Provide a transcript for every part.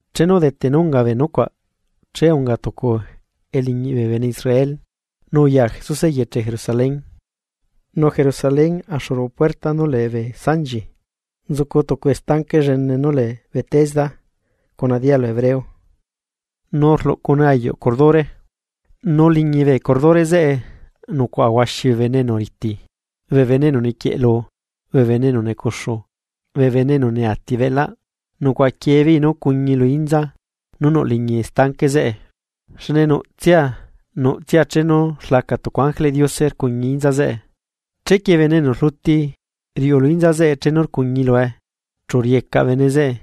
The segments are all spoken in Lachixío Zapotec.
Chenu udete nú unga bee nucuaꞌ che unga tucu eliñiꞌ bee bene Israel, nu uya Jesuse eyeche Jerusalén. Nu Jerusalén axu ruꞌu puerta nú lee bee sanchi, nzucu tucu estanque llene nú lee Betesda cuna dialu hebreo, nu rluꞌcune ayuꞌ curdure. Nu liñi bee curdure zeꞌe nucuaꞌa huaxi bee bene enu riti, bee bene enu niquieꞌlu, bee bene enu necuxu, bee bene enu neati beꞌlaꞌ. Nucuaꞌa quiebeei nú cuñi lu inza nú nuꞌ liñi estanque zeꞌe. Xne nuꞌtsia nuꞌtsia chenu rlaca tucu ángeleꞌ Diose rcuñi inza zeꞌe. Chequie bene enu rluti riuꞌu lu inza zeꞌe chenu rcuñi lue, chu riecaꞌ bene zeꞌe,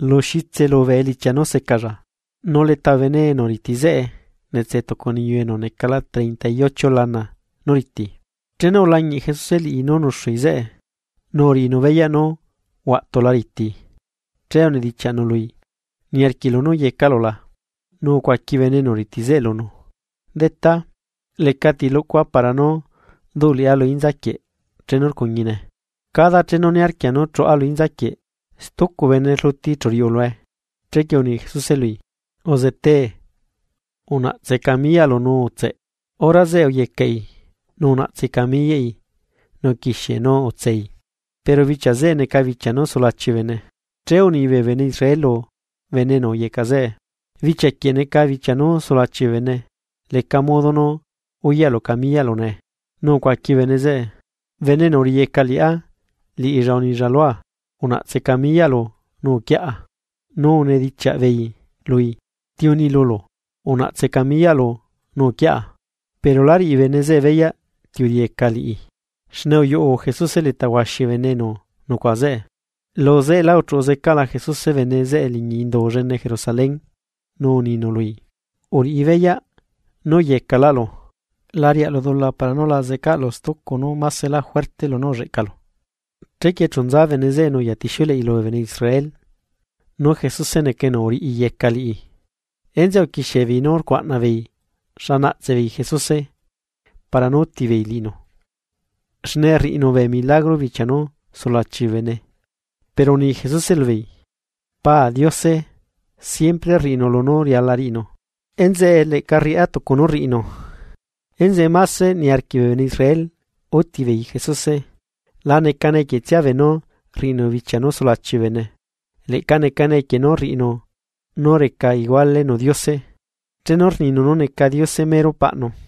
lu xitse lubee elichia nú secalla. Nu leta bee bene enu riti zeꞌe netse tucu niyu enu necala treinta y ocho lana nú riti. Chenu ulañiꞌ Jesuse liꞌi nú nuxui zeꞌe, nu uriꞌinu beyaꞌ nú huaꞌtula riti, che unidichiaꞌnu lui: ―¿Niarquiꞌlu nú yecaꞌlu la? Nu ucuaqui bene enu riti zeꞌe lunu: ―Detá, lecati lucua para nú duꞌ liꞌá lu inzaquieꞌ chenu rcuñine, cada chenu niarquia nú chuꞌa lu inzaquieꞌ, stucu bene rluti chu riuꞌu lue. Chequie uni Jesuse lui: ―Uzetee, unaꞌtse camiyaꞌlu nu utseꞌ. Hora zeꞌe uyecaꞌi, nu unaꞌtsei camiyaꞌi nu uquixiei nú utsei. Pero bichia zeꞌe neca bichia nú sulachi bee bene, che uni bee bene Israel lu bene enu uyecaꞌ zeꞌe: ―Bichia quieꞌ neca bichia nú sulachi bee bene, leca modo nú uyaꞌlu camiyaꞌlu nee. Nu ucuaqui bene zeꞌe: ―Bene enu uriꞌiyeca liꞌá, liꞌilla unilla lua: “Unaꞌtse camiyaꞌlu nu uquiaꞌa.” Nu unidichiaꞌ beei lui: ―¿Ti uni lulu: “Unaꞌtse camiyaꞌlu nu uquiaꞌa”? Pero la riꞌi bene zeꞌe beyaꞌ ti uriꞌiyeca liꞌi, xne uyuꞌu Jesuse leta huaxi bee bene enu nucuaꞌa zeꞌe. Luzeꞌelá uchuꞌu zecaꞌla Jesuse bene zeꞌe liñi indu llene Jerusalén, nu uninu lui: ―Uriꞌi beyaꞌ, nú uyecaꞌlaꞌlu, la riaꞌlu dula para nú la zecaꞌlu stucu nú maselá lunú ulleꞌcalu. Chequie chu nza bene zeꞌe nu uyatixiuleꞌi lubee bene Israel, nú Jesuse neca enu uriꞌiyeca liꞌi. Enzeꞌe uquixie beei nú rcuaꞌna beei xa naꞌtse beei Jesuse para nú úti beei liꞌinu, xne rriꞌinu bee milagrocuaꞌ bichia nú sulachi bee bene. Pero uni Jesuse lubeei: ―Pa Diose siempre rriꞌinu lunú riala riꞌinu, enzeꞌe leꞌca rriꞌá tucu nú rriꞌinu. Enzeꞌe máse niarquiꞌ bee bene Israel útibeei Jesuse, la necane equietsia beenú rriꞌinu bichia nú sulachi bee bene, leꞌca necane equie nú rriꞌinu nú reca igualenu Diose, chenu rninu nú neca Diose mero Paꞌnu.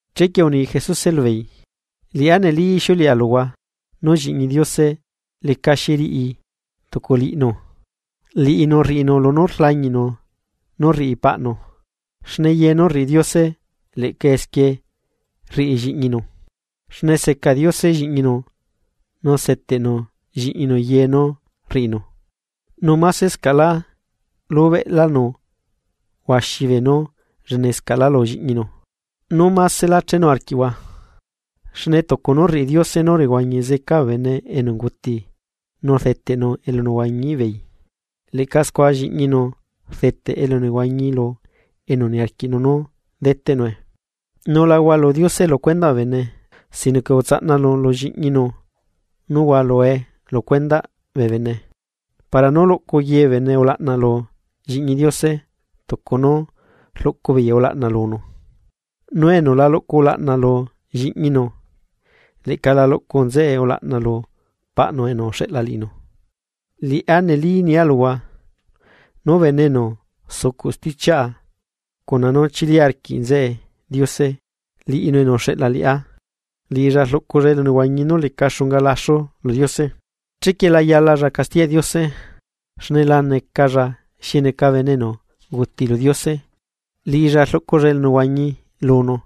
Chequie uni Jesuse lubeei: ―Liꞌá neli ixiuleꞌa luhua, nú Lliꞌñi Diose lecaxi riꞌi tuculiꞌnu, liꞌinu rriꞌinu lunú rlañiꞌnu nú rriꞌi Paꞌnu. Xne ye nú rriꞌi Diose leꞌca esquie rriꞌi Lliꞌñinu. Xne seca Diose Lliꞌñinu nu seteꞌnu Lliꞌñinu ye nú rriꞌinu, nu másescaꞌlá lubeꞌlánu huaxi beenú llenescaꞌlá lu Lliꞌñinu, nú másela chenu arquiꞌhua. Xne tucu nú rriꞌi Diose nú rehuañi zeca bee bene enu unguti nu rdeteꞌnu elunehuañiꞌ beei, leꞌca scua Lliꞌñinu rdeteꞌ elunehuañi lu enu niarquiꞌnu nú deteꞌnue. Nu la hualu Diose lu cuendaꞌ bee bene, sino que utsaꞌnanu lu Lliꞌñinu nú hualue lu cuendaꞌ bee bene, para nú luꞌcu ye bee bene ulaꞌna lu Lliꞌñi Diose tucu nú rluꞌcu beei ulaꞌna lunu. Nu enu la luꞌcu ulaꞌna lu Lliꞌñinu, leꞌca la luꞌcu nzeꞌe ulaꞌna lu Paꞌnu enu uxeꞌla liꞌinu. ’Liꞌá neli rnia luhua: Nú bene enu sucuꞌ stichiaꞌa, cuna nú chili arquiꞌ nzeꞌe Diose, liꞌinu enu uxeꞌla liꞌá, liꞌilla rluꞌculalla elunehuañi nú leca xunga laxu lu Diose. Chequie la yalaꞌlla castiyaꞌ Diose, xne la necaꞌlla xi neca bene enu unguti lu Diose, liꞌilla rluꞌculalla elunehuañi lunu.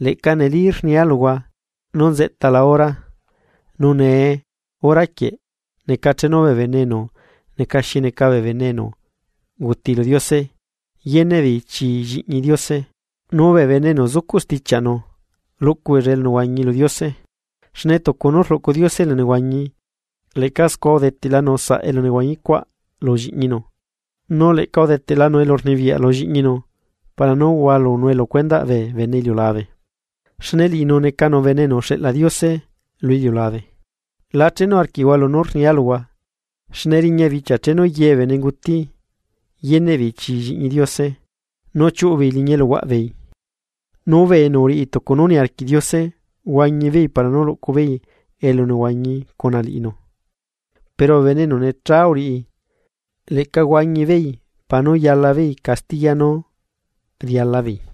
Leꞌca neli rnia luhua nú nzeꞌtala hora, nu nee hora quieꞌ, neca chenu bee bene enu neca xi neca bee bene enu unguti lu Diose, yeneꞌ beei chii Lliꞌñi Diose, nu bee bene enu zucuꞌ stichiaꞌnu, luꞌcu beella elunehuañi lu Diose. Xne tucu nú rluꞌcu Diose elunehuañi, leꞌca scua udeteꞌlanu saꞌ elunehuañicuaꞌ lu Lliꞌñinu, nu leꞌca udeteꞌlanu elurnibiyaꞌ lu Lliꞌñinu para nú hualunue lu cuendaꞌ bee bene iliulabe, xne liꞌinu necanu Bene enu uxeꞌla Diose lu iliulabe. La chenu arquiꞌhua lunú rnia luhua, xne riña bichia chenu ye bee bene nguti, yeneꞌ beei chi Lliꞌñi Diose nu chiuꞌubeei liñi eluhuaꞌbeei. Nu bee enu uriꞌi tucu nú niarquiꞌ Diose, huañi beei para nú luꞌcu beei elunehuañi cuna liꞌinu. Pero bee bene enu necha uriꞌi, leꞌca huañi beei para nú yala beei castiya nú riala beei.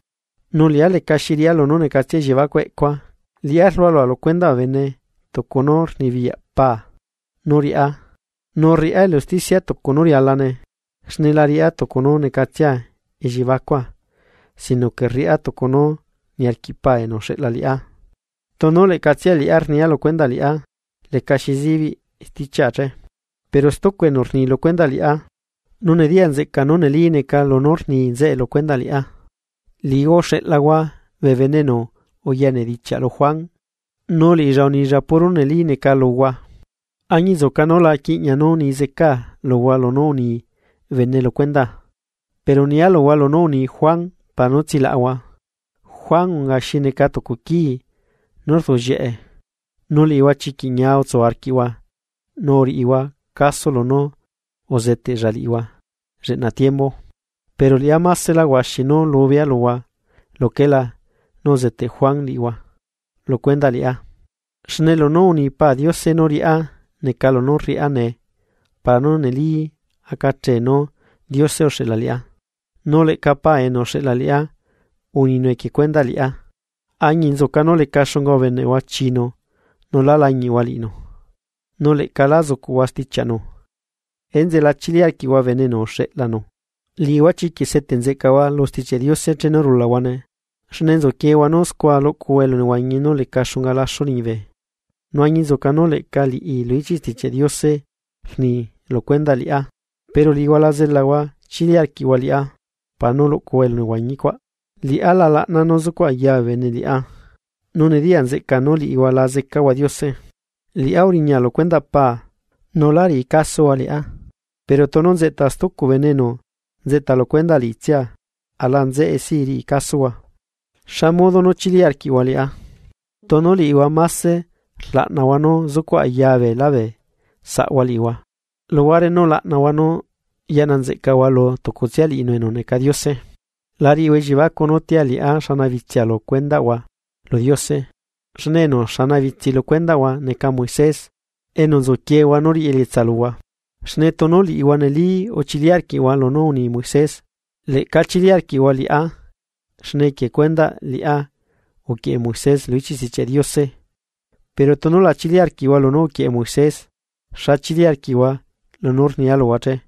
’Nu liꞌá lecaxi riꞌá lunú necatsia elliebacuꞌ eꞌcua. Liꞌá rlualua lu cuendaꞌ bee bene tucu nú rnibiyaꞌ paa, nu rriꞌá elu usticia tucu nú rialane, xne la riꞌá tucu nú necatsia ellibacua, sino que rriꞌá tucu nú niarquiꞌ Paa enu uxeꞌla liꞌá. Tunu leꞌcatsia liꞌá rnia lu cuendaꞌ liꞌá, lecaxi zibiꞌ stichiaꞌa che. Pero stucu enu rni lu cuendaꞌ liꞌá, nu nediya nzeꞌca nú neli neca lunú rni nzeꞌe lu cendaꞌ liꞌá. Liꞌihua uxeꞌlahua bee bene enu uya nedichiaꞌ lu Juan, nu liꞌilla unilla puro nú neli neca luhua. Añinzuca nú la quiꞌña nú ni zecaa luhua lunú uni bene lu cuendaa, pero nia luhua lunú uni Juan para nú tsilaꞌahua. Juan unga xi neca tucu quii nú rduꞌllieꞌe, nu liꞌihua chiquiꞌ ñia utsu arquiꞌhua nu uriꞌihua caso lunú uzeteꞌlla liꞌihua lleꞌna tiembu. Pero liꞌá másela huaxi nú lubea luhua luquelá nú uzeteꞌ Juan liꞌihua lu cuendaꞌ liꞌá. Xne lunú uni Pa Diose nú riꞌá neca lunú rriꞌá nee para nú neli acachee nú Diose uxeꞌla liꞌá. Nu leꞌca Paa enu uxeꞌla liꞌá, uninu equie cuendaꞌ liꞌá, añinzuca nú leca xunga ubeneꞌhua chiinu nu lá lañiꞌhua liꞌinu. Nu leꞌca lá zucuhua stichiaꞌnu, enzeꞌe la chili arquiꞌhua bene enu uxeꞌlanu. Liꞌihua chiquiꞌ seteꞌ nzeꞌcahua lu Stichiaꞌ Diose chenu rulahuane, xne nzuquiehua nú scua luꞌcuhua elunehuañi nú leca xunga laxu liñibe, nu añinzuca nú leꞌca liꞌi lu ichiꞌ Stichiaꞌ Diose rni lu cuendaꞌ liꞌá, pero liꞌihua la zelahua chili arquiꞌhua liꞌá para nú luꞌcuhua elunehuañicuaꞌ. ’Liꞌá la laꞌna nú zucuꞌ ayaa bee bene liꞌá. Nu nediya nzeꞌca nú liꞌihua la zecahua Diose. Liꞌá uriña lu cuendaꞌ Pa; nu lá riꞌi casohua liꞌá, pero tunu nzeꞌta stucu bene enu nzeꞌta lu cuendaꞌ liꞌitsia, aꞌla nzeꞌe si riꞌi casohua. ¿Xa modo nú chili arquiꞌhua liꞌá, tunu liꞌihua máse rlaꞌnahua nú zucuꞌ ayaa beelá bee saꞌhua liꞌihua, luhuare nú laꞌnahua nú yaꞌna nzeꞌcahua lu tucutsia liꞌinu enu neca Diose che? La riꞌihua elliebacuꞌ nú tia liꞌá xanabitsia lu cuendaꞌhua lu Diose, xne enu xanabitsi lu cuendaꞌhua neca Moisés, enu nzuquiehua nú riꞌi elietsa luhua. Xne tunu liꞌihua neli uchili arquiꞌhua lunú uni Moisés, leꞌca chili arquiꞌhua liꞌá, xne equie cuendaꞌ liꞌá uquieꞌe Moisés lu ichiꞌ Stichiaꞌ Diose. Pero tunu la chili arquiꞌhua lunú uquieꞌe Moisés, ¿xa chili arquiꞌhua lunú rnia luhua che?